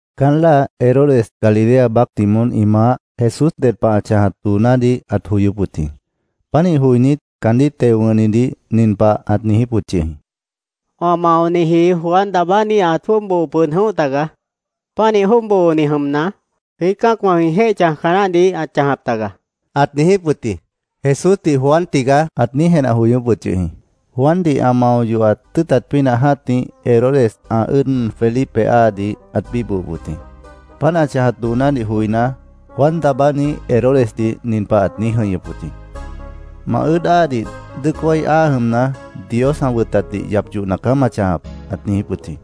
Caán láa Herodes, Galilea baácdih moón ĩ maáh, Jesús ded pah ã chãjat doonádih ãt joyóp wʉt jĩ. Pánih joinít, caandíh teo wʉ̃hnitdih nin pah ãt niijíp wʉt yʉh jĩ: “Wã maoniji Juan Daabáni ãt jwʉ́ʉb boo pʉd jʉ̃óh tagaá. Pánih jwʉ́ʉb booni jʉmna, jwiít cã́acwã jwĩ jéih chãjca naáhdih ãt chãjap taga”, ãt niijíp wʉt jĩ. Jesúsdih “Juan tigaá”, ãt niíj jenah joyóp wʉt yʉh jĩ. Juandih ã mao yohat tʉ́ʉtat pínah jã́tih, Herodes ã ʉ́ʉd Felipe áadih ãt bíbohop wʉt jĩ. Páant ã chãjat doonádih joiná, Juan Daabáni Herodesdih nin pah ãt niíj jʉ̃ihñʉp wʉt jĩ: “Ma ʉ́ʉd áadih dʉ́ʉc wái áa jʉmna, Dios ã wʉtatdih yap yohna caá ma chãjap”, ãt niijíp wʉt jĩ.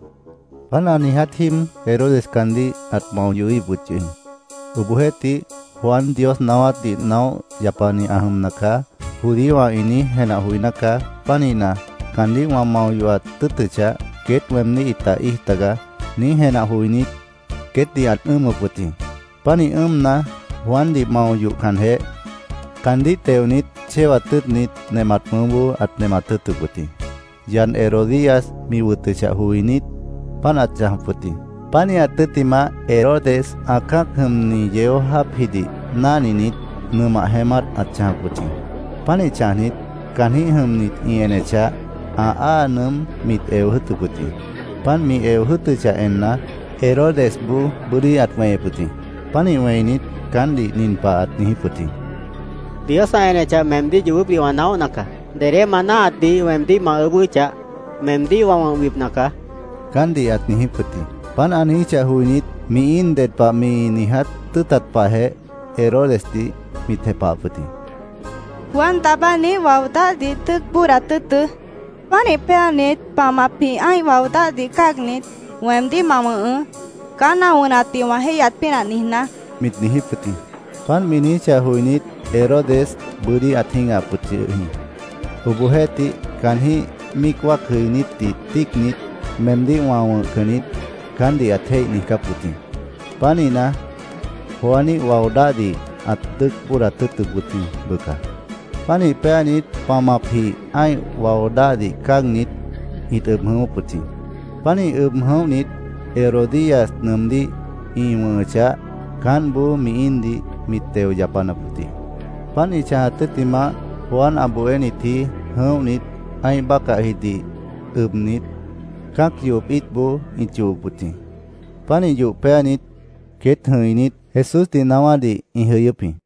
Páant ã niiját jíib Herodes caandíh ãt mao yohíhip wʉt yʉh jĩ. Obohjeéhtih, “ ‘Juan Dios naáwátdih naóh yapani ã jʉmna caá’, judíowã ĩ niíj jenah joiná caá. Pánihna, caandíh wã mao yohat tʉ́ʉtʉchah, queét weemdíh ĩta íij tagaá”, niíj jenah joinít, queétdih ãt ʉ́ʉmʉp wʉt jĩ. Pánih ʉ́ʉmna, Juandih mao yohcanjeh, caandíh teonit, chéwat tʉ́ʉtnit, nemat mʉʉ́boó ãt nemat tʉ́ʉtʉp wʉt jĩ. Yad Herodías mi wʉtʉchah joinít, páant ãt chãjap wʉt jĩ. Pánihat tʉ́ttimah, Herodes ã cã́ac jʉmni yeó jáapjidih náhninit, nʉmah jeémát ãt chãjap wʉt jĩ. Pánih chãjnit, caanjĩ́h jʉmnit ĩ enechah, ã aá nʉʉ́m mit eo jʉ́ʉtʉp wʉt jĩ. Páant mi eo jʉ́ʉtʉchah enna, Herodesboó bʉ́dí ãt weñep wʉt jĩ. Pánih wẽinit, caántdih nin pah ãt niijíp wʉt jĩ: —Dios ã enechah, meemdíh yoobópdih wã naóhna caá. Dedé ma náahatdih weemdíh ma ʉʉ́bʉ́chah, meemdíh wã wʉ̃hbipna caá, caántdih ãt niijíp wʉt jĩ. Páant ã niijíchah joinít, mi íin ded pah mi niiját tʉ́ʉtat pahjeh Herodesdih mit jepahap wʉt jĩ. —Juan Daabániíh wao dáhdih dʉ́ʉc bóodat tʉ́ʉtʉ́. Pánih péanit, pamapjih ã́ih wao dáhdih cáagnit, weemdíh ma wʉ̃hʉʉ́, caán ã wʉnatdih wã jéihyat pínah niijná, mit niijíp wʉt jĩ. Páant mi niijíchah joinít, Herodes bʉ́dí ãt jĩ́gahap wʉt yʉh jĩ. Obohjeéhtih, caanjĩ́h míic wáacnitdih tíicnit, “Meemdíh wã wʉ̃hcan niít”, caántdih ãt jéih niijcáp wʉt jĩ. Pánihna, Juaníh wao dáhdih ãt dʉ́ʉc bóodat tʉ́ʉtʉp wʉt jĩ, bʉca. Pánih péanit, pamapjih ã́ih wao dáhdih cáagnit, ĩt ʉb jʉ̃ʉ́wʉ́p wʉt jĩ. Pánih ʉb jʉ̃óhnit, Herodías nʉʉmdíh ĩ wʉ̃hʉchah, caántboó mi íindih mit teo yapanap wʉt jĩ. Páant ĩ chãjat tʉ́ttimah, Juan ã bohénitji jʉ̃óhnit, ã́ih bácahjidih ʉbnit, cã́ac yohop íitboó ĩt yohop wʉt jĩ. Pánih yoh péanit, queét jʉ̃inít, Jesúsdih naáwádih ĩ jʉyʉ́p jĩ.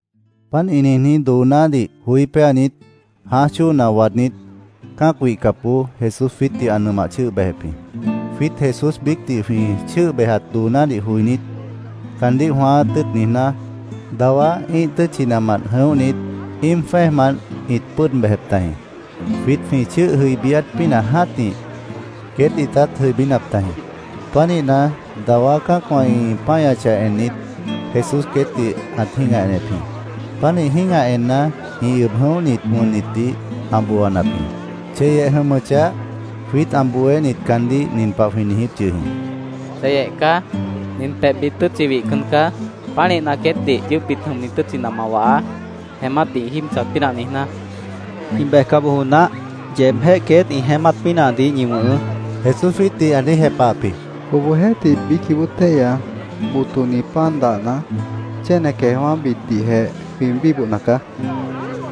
Páant ĩ niijní doonádih joí péanit, jãáj chóona waadnít, cã́ac wihcapboó Jesús jwiítdih ã nʉmah chʉ́ʉh bejep jĩ. Jwiít Jesús biícdih jwĩ chʉ́ʉh bejat doonádih joinít, caandíh jwãáát tʉ́ʉt niijná, dawá ĩ́ih tʉ́tchinamant jʉ̃óhnit, íim jwẽ́ejmant ĩt pʉ́ʉd bejep tajĩ. Jwiít jwĩ chʉ́ʉh jʉibíát pínah jã́tih, queét ĩtát jʉibínap tajĩ. Pánihna, dawá cã́acwã ĩ páñachah ennit, Jesús queétdih ãt jĩ́gah enep jĩ. Pánih jĩ́gah enna, ĩ ʉb jʉ̃óhnit wʉnnitdih ã booanap jĩ. Cheyeh jʉmʉchah, jwiít ã bohénit caandíh nin pah jwĩ niijíp yʉh jĩ: —Cheyeh caá. Nin pebhbit tʉ́tchi wihcan caá. Pánihna, queétdih yʉʉ́pbit jʉmni tʉ́tchina ma wahaá, jeémátdih ĩ jíib chãjat pínah niijná, jwĩ niijíp jĩ. —Ĩ bejca bojo naáh. Yeebjéh queét ĩ jeémát pínahdih ñi wʉ̃hʉʉ́, Jesús jwiítdih ã niíj jepahap jĩ. —Obohjeéhtih, biícjĩh bóo téihya botoni pan dahna, chéne queejwã́bitdihjeh jwĩ bíbohna caá, jwĩ niijíp jĩ.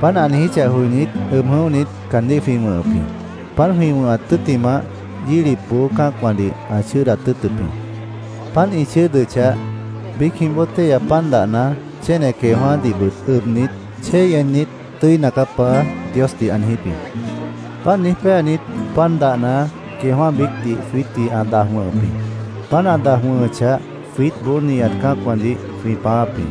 Páant ã niijíchah joinít, ʉb jʉ̃óhnit, caandíh jwĩ wʉ̃hʉp jĩ. Páant jwĩ wʉ̃hat tʉ́ttimah, yílipboó cã́acwãdih ã chʉ́ʉdat tʉ́ʉtʉp jĩ. Páant ĩ chʉ́ʉdʉchah, biícjĩh bóo téihya pan dahna chéne queejwã́dihbʉt ʉbnit, chéi ennit, “Tʉ́ina caá, Paá”, Diosdih ã niijíp jĩ. Páant niíj péanit, pan dahna, queejwã́ biícdih jwiítdih ã daj wʉ̃hʉp jĩ. Páant ã daj wʉ̃hʉchah, jwiítboó nihat cã́acwãdih jwĩ pãááp jĩ.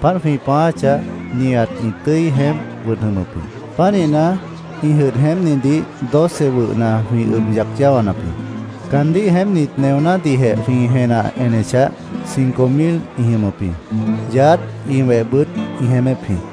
Páant jwĩ pãááchah, nihat ĩ tʉ́i jeémp wʉd jʉmʉp jĩ. Pánihna, ĩ jʉdh jeémpnidih doce wʉhna jwĩ ʉb yac yáwanap jĩ. Caandíh jeémpnit neonádihjeh jwĩ jenah enechah, cinco mil ĩ jʉmʉp jĩ. Yaádh, ĩ wehbʉt ĩ jeémép jĩ.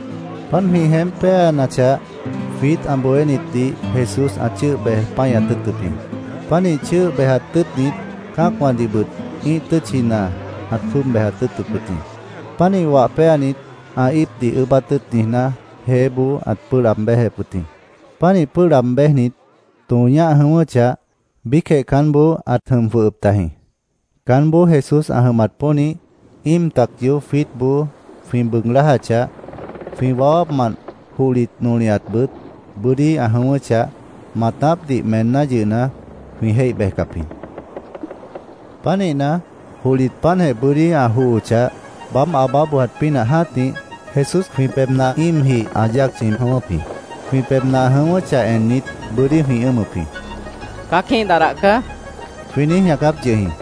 Páant jwĩ jeémp péanachah, jwiít ã bohénitdih Jesús ã chʉ́ʉh bej páñat tʉ́ʉtʉp jĩ. Pánih chʉ́ʉh bejat tʉ́ʉtnit, cã́acwãdihbʉt ĩ́ih tʉ́tchina ãt jwʉ́ʉb bejat tʉ́ʉtʉp wʉt jĩ. Pánih wah péanit, ã íipdih ʉʉ́bát tʉ́ʉt niijná, jeéboó ãt pʉ́ʉh laab béjep wʉt jĩ. Pánih pʉ́ʉh laab béjnit, tõo ñáh jʉ̃ʉ́wʉ́chah, biícjeh caánboó ãt jʉm jwʉhʉp tajĩ. Caánboó Jesús ã jʉmat pónih, íim tac yoób jwiítboó jwĩ bʉʉg lájachah, jwĩ wawápmant johlit, nolihatbʉt bʉ́dí ã jʉ̃ʉ́wʉ́chah, maatápdih meenná yʉhna, jwĩ jéih bejcap jĩ. Pánihna, johlit páantjeh bʉ́dí ã johochah, baáb aabá bojat pínah jã́tih, Jesús jwĩ pebhna íimjih ã yáac chʉ̃i jʉ̃ʉ́wʉ́p jĩ. Jwĩ pebhna ã jʉ̃ʉ́wʉ́chah ennit, bʉ́dí jwĩ ʉ́ʉmʉp jĩ. —¡Cã́aquíh dadah caá! jwĩ niíj ñaacáp yʉh jĩ.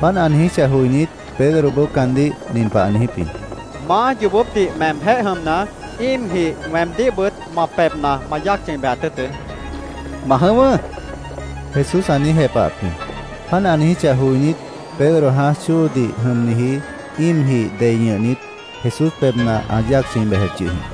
Páant ã niijíchah joinít, Pedroboó caandíh nin pah ã niijíp jĩ: —Maá, yoobópdih meemjéh jʉmna, íimjih weemdíhbʉt ma pebhna ma yáac chʉ̃i bejat tʉ́ʉtʉ́, ã niijíp jĩ. —Ma jʉ̃ʉ́wʉ́, Jesús ã niíj jepahap jĩ. Páant ã niijíchah joinít, Pedro jãáj chóodih jʉmniji íimjih dei ñʉhnit, Jesús pebhna ã yáac chʉ̃i bejep yʉh jĩ.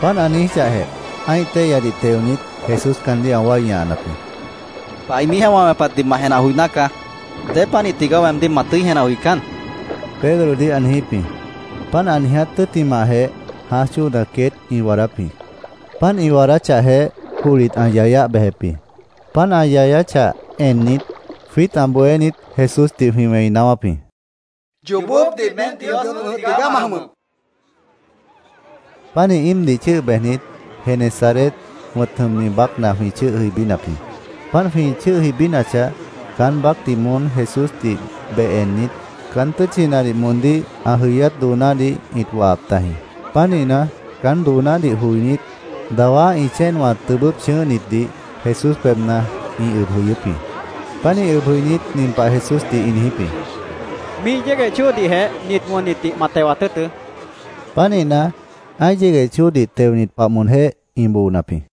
Páant ã niijíchahjeh, ã́ih téihyadih teonit, Jesús caandíh ã wái ñahanap jĩ. —¡Bainíjeh wã wẽpatdih ma jenah joiná caá! ¿Dépanih tigaá weemdíh ma tʉ́i jenah joicán? Pedrodih ã niijíp jĩ. Páant ã niiját tʉ́ttimahjeh, jãáj chóona queét ĩ waadáp jĩ. Páant ĩ waadáchahjeh, johlit ã yayáh bejep jĩ. Páant ã yapachah ennit, jwiít ã bohénit Jesúsdih jwĩ wẽi naáwáp jĩ. —¡Yoobópdih meém Dios wʉ̃ʉ́h tigaá ma jʉmʉp! jwĩ niijíp jĩ. Pánih íimdih chʉ́ʉh bejnit, Genesaret wʉ̃t jʉmni baácna jwĩ chʉ́ʉh jʉibínap jĩ. Páant jwĩ jʉibínachah, caán baácdih moón Jesúsdih beh ennit, caán tʉ́tchinadih moondíh ã jʉyát doonádih ĩt wahap tajĩ. Pánihna, caán doonádih joinít, dawá ĩ chéenwã tʉbʉ́p chʉ̃ʉ́hnitdih Jesús pebhna ĩ ʉb jʉyʉ́p jĩ. Pánih ʉb jʉinít, nin pah Jesúsdih ĩ niijíp jĩ: —Míih yégueh chóodihjeh nit wʉnnitdih ma tewat tʉ́ʉtʉ́, ĩ niijíp jĩ. Pánihna, ã́ih yégueh chóodih teonit pah moonjéh ĩ boonap jĩ.